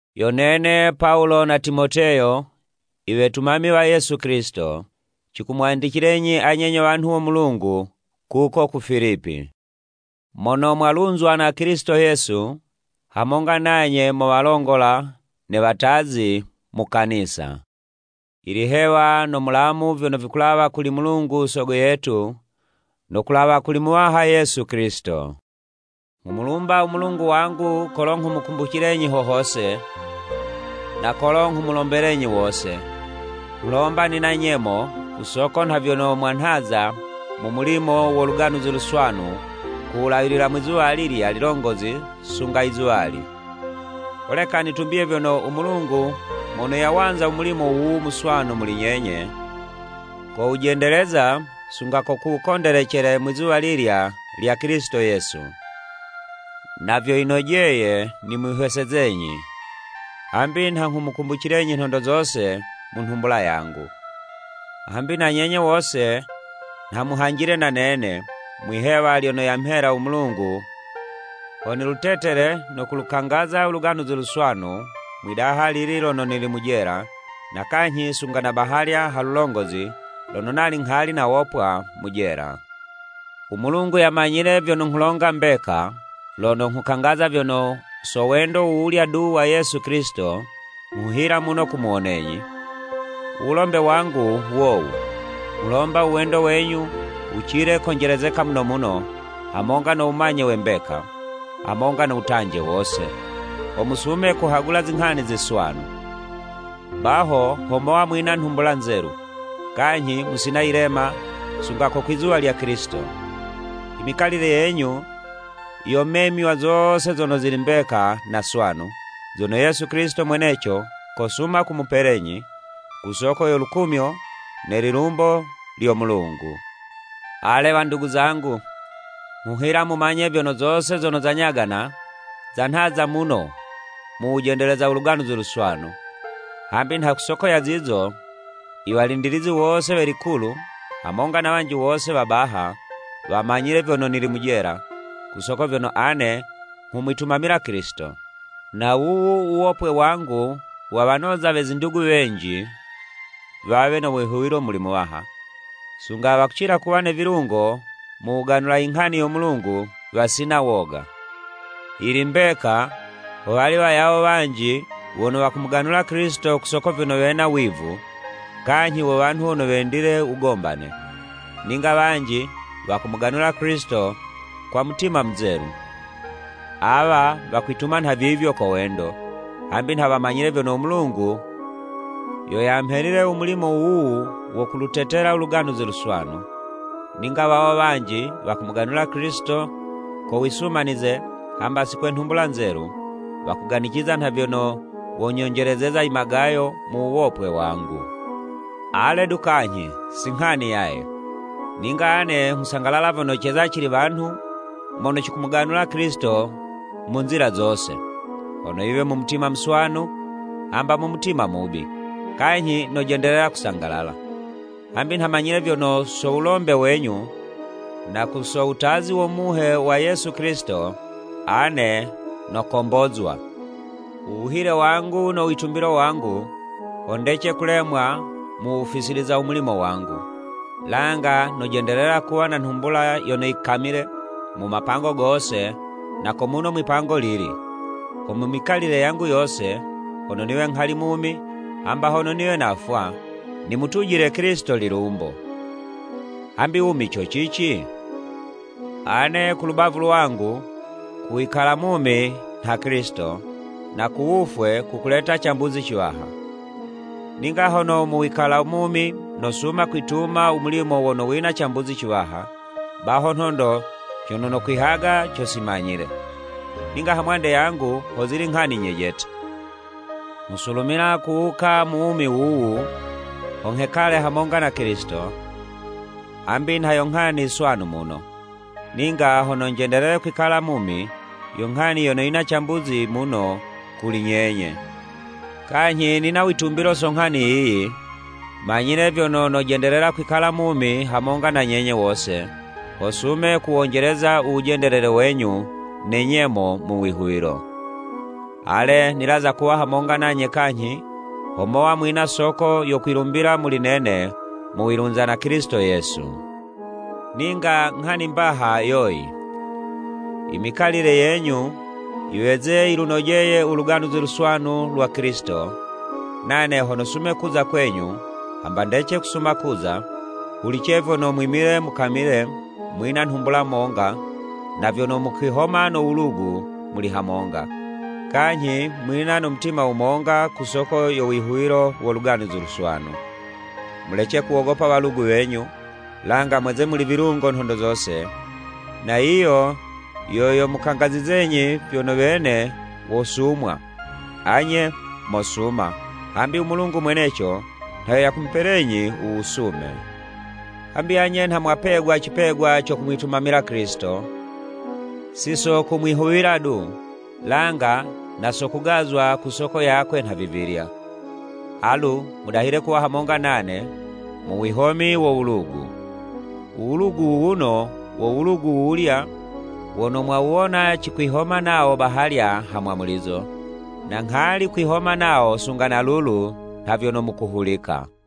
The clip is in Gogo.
Yo nene Pawulo na Timoteyo, i wetumami wa Yesu Kilisito, cikumwandicilenyi anye nyo wanhu wo Mulungu kuko ku Filipi, mono mwalunzwa na Kilisito Yesu, hamonga nanye mo walongola ne watazi mu Kanisa. Ilihewa no mulamu vyono vikulawa kuli Mulungu Sogo yetu, no kulawa kuli Muwaha Yesu Kilisito. Nghumulumba u Mulungu wangu kolo nghumukumbucilenyi ho hose, na kolo nghumulombelenyi wose, nghulomba nina nyemo, ku soko nha vyono mwanhaza mu mulimo wo Luganuzi Luswanu ku wulawilila mwi'zuwa alilya lilongozi sunga izuwali. Holeka nitumbiye vyono, u Mulungu mono yawanza u mulimo wuwu muswanu muli nyenye, kowujendeleza sunga ko ku wukondelecele mwi'zuwa lilya lya Kilisito Yesu. Na vyo yinojeye nimwihwesezenyi, hambi nha nghumukumbucilenyi nhondo zose mu nhumbula yangu. Hambi na nyenye wose, nha muhanjile na nene, mwi'hewa lyono yamhela u Mulungu ho nilutetele no kulukangaza u Luganuzi Luswanu, mwi'daha lili lono nili mu jela, na kanyhi sunga na bahalya ha lulongozi lono nali nghali nawopwa mu jela. U Mulungu yamanyile vyono nghulonga mbeka, lono nghukangaza vyono, so wendo wuwulya du wa Yesu Kilisito, nghuhila muno kumuwonenyi. U wulombe wangu wowu, nghulomba u wendo wenyu wucile konjelezeka muno muno, hamonga no wumanye we mbeka, hamonga no wutanje wose, ho musume kuhagula zinghani ziswanu. Baho ho mowa mwina nhumbula nzelu, kanyhi musina yilema sunga ko Kwi'zuwa lya Kilisito. I mikalile yenyu yomemywa zose zono zili mbeka na swanu, zono Yesu Kilisito mweneco kosuma kumupelenyi, ku soko yo lukumyo ne lilumbo lyo Mulungu. Ale wandugu zangu, nghuhila mumanye vyono, zose zono zanyagana, zanhaza muno mu wujendeleza u Luganuzi Luswanu. Hambi nha ku soko ya zizo, i walindilizi wose we likulu, hamonga na wanji wose wa baha, wamanyile vyono nili mu jela, ku soko vyono ane nghumwitumamila Kilisito. Na wuwu wuwopwe wangu wawanoza we zindugu wenji wawe no wihuwilo muli Muwaha, sunga wakucila kuwa ne vilungo mu wuganula i nghani yo Mulungu wasina woga. Yili mbeka, ho wali wayawo wanji wono wakumuganula Kilisito ku soko vyono wena wivu, kanyhi wo wanhu wono wendile wugombane, ninga wanji wakumuganula Kilisito kwa mutima muzelu. Awa wakwituma nhavivyo ko wendo, hambi nha wamanyile vyono u Mulungu yo yamhelile u mulimo wuwu wo kulutetela u Luganuzi Luswanu. Ninga wawo wanji wakumuganula Kilisito ko wisumanize hamba si kwa nhumbula nzelu, wakuganiciza nha vyono wonyonjelezeza i magayo mu wuwopwe wangu. Ale du kanyhi, si nghani yaye, ninga ane nghusangalala vyono ceza cili wanhu mono cikumuganula Kilisito mu zinzila zose, hono yiwe mu mutima muswanu, hamba mu mutima mubi. Kanyhi nojendelela kusangalala. Hambi nha manyile vyono, so wulombe wenyu na ku so wutazi wo Muhe wa Yesu Kilisito ane nokombozwa. U wuhile wangu no witumbilo wangu, ho ndece kulemwa mu wufisiliza u mulimo wangu, langa nojendelela kuwa na nhumbula yono yikamile mu mapango gose na ko muno mwipango lili, ho mu mikalile yangu yose, hono niwe nghali mumi hamba hono niwe nafwa, nimutujile Kilisito lilumbo. Hambi wumi co cici? Ane ku lubavu lwangu, ku wikala mumi nha Kilisito, na ku wufwe kukuleta cambuzi ciwaha. Ninga hono mu wikala mumi nosuma kwituma u mulimo wono wina cambuzi ciwaha, baho nhondo cono nokwihaga co si manyile! Ninga ha mwande yangu ho zili nghani nyejete. Nghusulumila kuwuka mu wumi wuwu, ho nghekale hamonga na Kilisito, hambi nha yo nghani swanu muno, ninga hono njendelele kwikala mumi, yo nghani yono yina cambuzi muno kuli nyenye. Kanyhi nina witumbilo so nghani yiyi, manyile vyono nojendelela kwikala mumi hamonga na nyenye wose, ho sume kuwonjeleza u wujendelele wenyu ne nyemo mu wihuwilo. Ale nilaza kuwa hamonga nanye kanyhi, ho mowa mwina soko yo kwilumbila muli nene mu wilunza na Kilisito Yesu. Ninga nghani mbaha yoyi, i mikalile yenyu yiweze yilunojeye u Luganuzi Luswanu lwa Kilisito, nane hono sume kuza kwenyu, hamba ndece kusuma kuza, hulice vyono mwimile mukamile mwina nhumbula monga, na vyono mukwihoma no wulugu muli hamonga, kanyhi mwina no mutima wumoga ku soko yo wihuwilo wo Luganuzi Luswanu. Mulece kuwogopa walugu wenyu, langa mweze muli vilungo nhondo zose, na yiyo yo yomukangazizenyi vyono wene wosumwa, anye mosuma, hambi u Mulungu mweneco nha yo yakumupelenyi u wusume. Hambi anye nha mwapegwa cipegwa co kumwitumamila Kilisito, si so kumwihuwila du, langa na so kugazwa ku soko yakwe nhavivilya. Alu mudahile kuwa hamonga nane mu wihomi wo wulugu. U wulugu wuwuno, wo wulugu wuwulya wono mwawuwona cikwihoma nawo bahalya ha mwamulizo, na nghali kwihoma nawo sunga na lulu nha vyono mukuhulika.